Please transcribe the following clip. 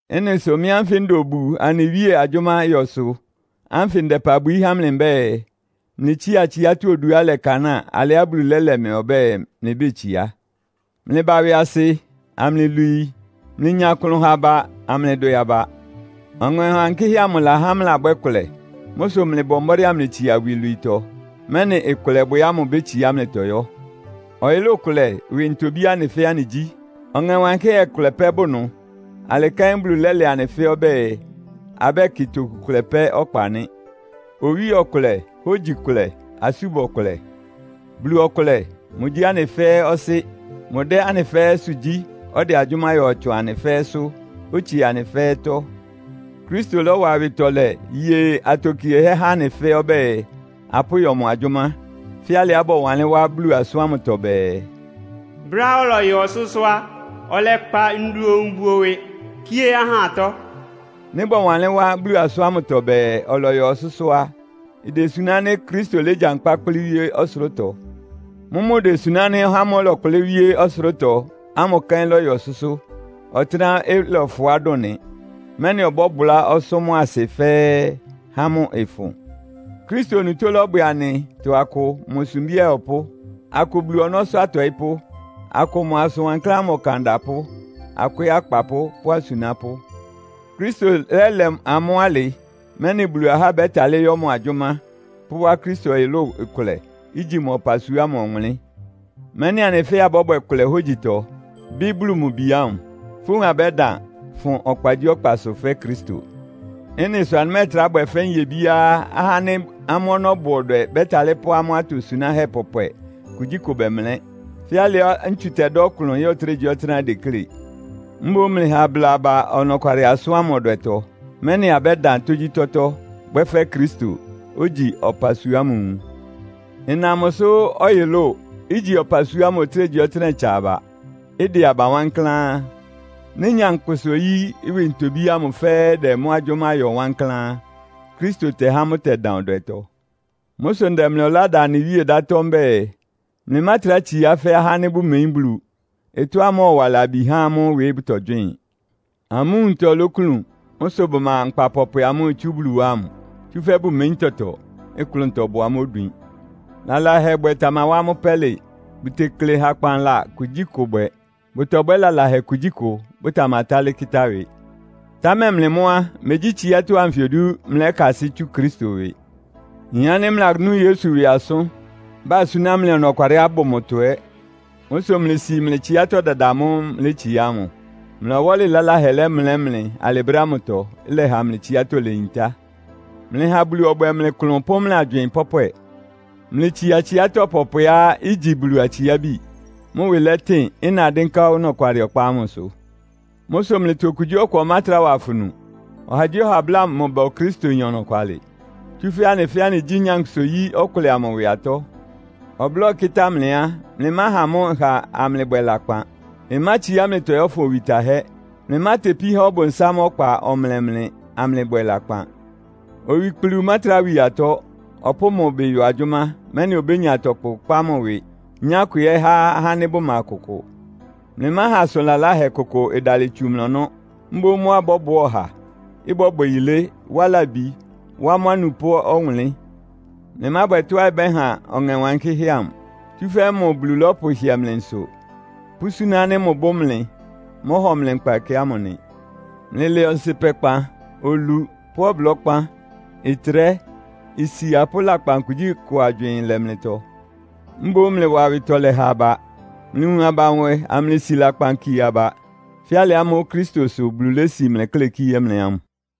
Ɩ́nɩ sʋ mɩ́ ánfɩ nda obu anɩ Wíe agyʋ́má yɔ sʋ ánfɩ ndɛ ɩpa bwií há mlɩ mbɛ́ɛ, mlɩtsía tsiátɔ́ oduá ɩlɛkanáa alɩá Bulu lɛ́lɛ mlɩ ɔbɛ́ɛ, mlɩbétsiá. Mlɩba ɩwɩasɩ, amlɩlwii. Mlɩnya klʋn ha aba, amlɩdwɛ aba. Ɔŋɛ Wankɩ́hɛ́ amʋ lahá mlɩlabwɛ́ kʋlɛ. Mʋ́ sʋ mlɩbɔ mbɔ́dɩ́ amlɩtsia iwilwiitɔ, mɛ́nɩ ɩkʋlɛbwɛ ámʋ ibétsiá mlɩtɔ yɔ́. Ɔyʋlʋ́ʋ kʋlɛ ɩwɩ ntobí anɩ fɛ́ɛ́ anɩgyí. Ɔŋɛ Wankɩ́hɛ́ kʋlɛ pɛ́ bʋ ɩnʋ. Alɩ kɛ́n Bulu lɛ́lɛ anɩ fɛ́ɛ́ ɔbɛ́ɛ, abɛ́kɩ toku kʋlɛ pɛ́ ɔkpa nɩ́. Owíe ɔkʋlɛ; hógyi kʋlɛ; asúbɔ kʋlɛ. Bulu ɔkʋlɛ. Mʋgyí anɩ fɛ́ɛ́ Ɔsɩ́. Mʋdɛ́ anɩ fɛ́ɛ́sʋ́ gyí, ɔdɛ agyʋ́má yɔ tsʋn anɩ fɛ́ɛ́sʋ́, otsie anɩ fɛ́ɛ́tɔ́. Kristo lɔ́wa awɩtɔlɛ ye atokiehɛ́ há anɩ fɛ́ɛ́ ɔbɛ́ɛ, apʋ́yɔ mʋ agyʋ́má, fɛ́ alɩá bɔwanlɩ́n wá Bulu asʋ́n ámʋtɔ bɛɛ, “Brɛ́á ɔlɔyɔ ɔsʋ́sʋ́ á, ɔlɛkpa ndoun buo ɩwɩ, kíé ahá atɔ́.” Nɩ́ bɔwanlɩ́n wá Bulu asʋ́n ámʋtɔ bɛɛ, “Ɔlɔyɔ ɔsʋ́sʋ́” á, idesuná ánɩ́ Kristo légyankpá kplɩ́ wíé ɔsʋlʋ́tɔ. Mʋ́mʋ́ idesuná ánɩ́ ɔhá ámʋ́ʋ́ ɔlɛkplɩ́ wíé ɔsʋlʋ́tɔ ámʋ kɛ́n lɔ́yɔ ɔsʋ́sʋ́, ɔtɩ́nɛ́á ɩlɔfʋá dʋn nɩ, mɛ́nɩ ɔbɔ́bʋlá ɔsʋ́ mʋ́a asɩ fɛ́ɛ́, há mʋ́ ɩfʋn. Kristo onutó lɔ́bwɛ anɩtɔ akʋ mʋ sumbí ayɔpʋ́. Akʋ Bulu ɔnɔ́sʋ́ atɔɩ́pʋ́. Akʋ mʋ asʋn wankláán ámʋ ɔkan adapʋ́. Akʋ ɛ́ akpapʋ́ pʋ́ asunápʋ́. Kristo lɛ́lɛ amʋ́ alɩ, mɛ́nɩ Bulu ahá bɛ́talɩ́ yɔ́ mʋ agyʋ́má, pʋ́wá Kristo ɔyʋlʋ́ʋ ɩkʋlɛ; ígyi mʋ ɔpasua ámʋ ɔwʋnlɩ́n, mɛ́nɩ anɩ fɛ́ɛ́ abɔ́bwɛ kʋlɛ hógyitɔ, bɩ́ Bulu mʋ Bi ámʋ. Fówun abɛ́dan, fʋn ɔkpagyíɔkpasʋ fɛ́ Kristo. Ɩ́nɩ sʋ anɩmɛ́ɛtrá bwɛ fɛ́ nyebíá ahá ánɩ́ amʋ́ ɔnɔ́ bʋ ɔdwɛ bɛ́talɩ́ pʋ́ amʋ́ atosunáhɛ́ pɔpwɛ kugyíkʋ bɛmlɛ́, fɛ́ alɩá ntsu tɛdá ɔklʋn ya ɔtɩ́nɛgyíɔtɩ́nɛ́á ideklé. Mboún mlɩha abláa aba ɔnɔkwalɩ asʋ́n ámʋ ɔdwɛtɔ, mɛ́nɩ abɛ́dan tógyítɔ́tɔ́, bwɛ́ fɛ́ Kristo, ogyi ɔpasua ámʋ nwun. Ɩna mʋsʋ ɔyʋlʋ́ʋ, igyi ɔpasua ámʋ ɔtɩ́nɛgyíɔtɩ́nɛ́ ɩtsa aba, ɩdɛ aba wankláán. Nɩ́ nyankpʋsa-oyí ɩwɩ ntobí ámʋ fɛ́ɛ́ ɩdɛ mʋ́ agyʋ́má yɔ wankláán á, Kristo tɛhá mʋ́ ɩtɛdan ɔdwɛtɔ. Mʋ́ sʋ ndɛ mlɩ ɔlá da anɩ Wíe ɩdátɔ́ mbɛ́ɛ, mlɩmátrá tsiá fɛ́ ahá ánɩ́ bʋmeyín Bulu. Ɩtɔ́á mɔ́ɔwa labi há amʋ́ ɩwɩ bʋtɔgywɩ́ɩn. Amʋ́ nwuntɔ lóklun. Mʋ́ sʋ bʋma nkpa pɔpwɛ amʋ́ʋ́ itsú Bulu wá ámʋ, tsúfɛ́ bʋmeyín tɔtɔ. Ɩklʋntɔ bʋ amʋ́ odwin. Lalahɛbwɛ tamawá amʋ́ pɛ́lɩ, bʋtekle hakpanla kugyíkʋ bwɛ. Bʋtɔbwɛ́ lalahɛ kugyíkʋ, bʋtamatálɩ́ kɩ́tá ɩwɩ. Támɛ mlɩ mʋ́ á, megyí tsiátɔ́ anfɩ odu mlɩlɛ́kasɩ́ tsú Kristo ɩwɩ. Nyin ánɩ́ mlɩlanú Yesu ɩwɩ asʋ́n, basúná mlɩ ɔnɔkwalɩá ɩbʋ mʋtɔ ɛ́. Mʋ́ sʋ mlɩsi mlɩ tsiátɔ́ dada amʋ́ʋ́ mlɩlétsiá ámʋ. Mlɩ ɔwɔ́lɩ laláhɛ lɛ́mlɛ́ mlɩ alɩ brɛ́ ámʋtɔ, ɩlɛha mlɩ tsiátɔ́ leyintá. Mlɩha Bulu ɔbwɛ mlɩ klʋn pʋ́ mlɩ agywɩɩn pɔ́pwɛ. Mlɩtsia tsiátɔ́ pɔpwɛá igyi Bulu atsiábi, mʋ́ ɩwɩ lɛtɩn, ɩna dɩ́nká ɔnɔkwalɩ ɔkpa ámʋsʋ. Mʋ́ sʋ mlɩtɔ okugyíɔkʋ ɔmátrá wa afunu. Ɔhagyíɔha ɔbláa mʋ ba Okristoyin ɔnɔkwalɩ. Tsúfɛ́ anɩ fɛ́ɛ́ anɩgyí nyankpʋsa-oyí ɔkʋlɛ amʋ ɩwɩ atɔ́. Ɔblɔ́ ɩkɩ́tá mlɩ á, mlɩmáha mʋ́ ɩha amlɩbwɛ lakpan. Ɩmátsiá mlɩtɔ yɔ́fʋn owi tahɛ́. Mlɩmátepí há Ɔbʋnsám ɔkpa ɔmlɛ mlɩ, amlɩbwɛ lakpan. Owikplu mátrá wi atɔ́. Ɔpʋ́ʋ mʋ ɩbɩ yɔ agyʋ́má, mɛ́nɩ obénya tɔkʋ kpá mʋ ɩwɩ, nyá ɩkʋ ɛ́ há ahá ánɩ́ bʋma kʋkʋ. Mlɩmáha asʋn laláhɛ kʋkʋ ɩdalɩ tsu mlɩ ɔnɔ́. Mboún mʋ́á ɩbɔ́bʋá ɔha, ɩbɔ́bwɛ yilé, wá labi, wá mʋ́ anupʋ́ ɔwʋnlɩ́n. Mlɩmábwɛ tɔ́á ɩbɛ́han Ɔŋɛ Wankɩ́hɛ́ amʋ. Tsúfɛ́ mʋ Bulu lɔ́pʋhɩɛ mlɩ nsʋ, pʋ́súná ánɩ́ mʋbʋ́ mlɩ, mɔ́hɔ mlɩ nkpa ɛkɛ ámʋ nɩ. Mlɩlɛ ɔnsɩpɛkpan, olu pʋ́ ɔblɔ́kpán, ɩtrɛ́, isia pʋ́ lakpan kugyíkʋ agywɩɩn lɛ mlɩtɔ. Mboún mlɩwa awɩtɔlɛ ha aba. Mlɩwun aba nwɛ, amlɩsi lakpan kie aba fɛ́ alɩ ámʋ́ʋ́ Kristo sʋ Bulu lési mlɩ klɛ́ kíé mlɩ ámʋ.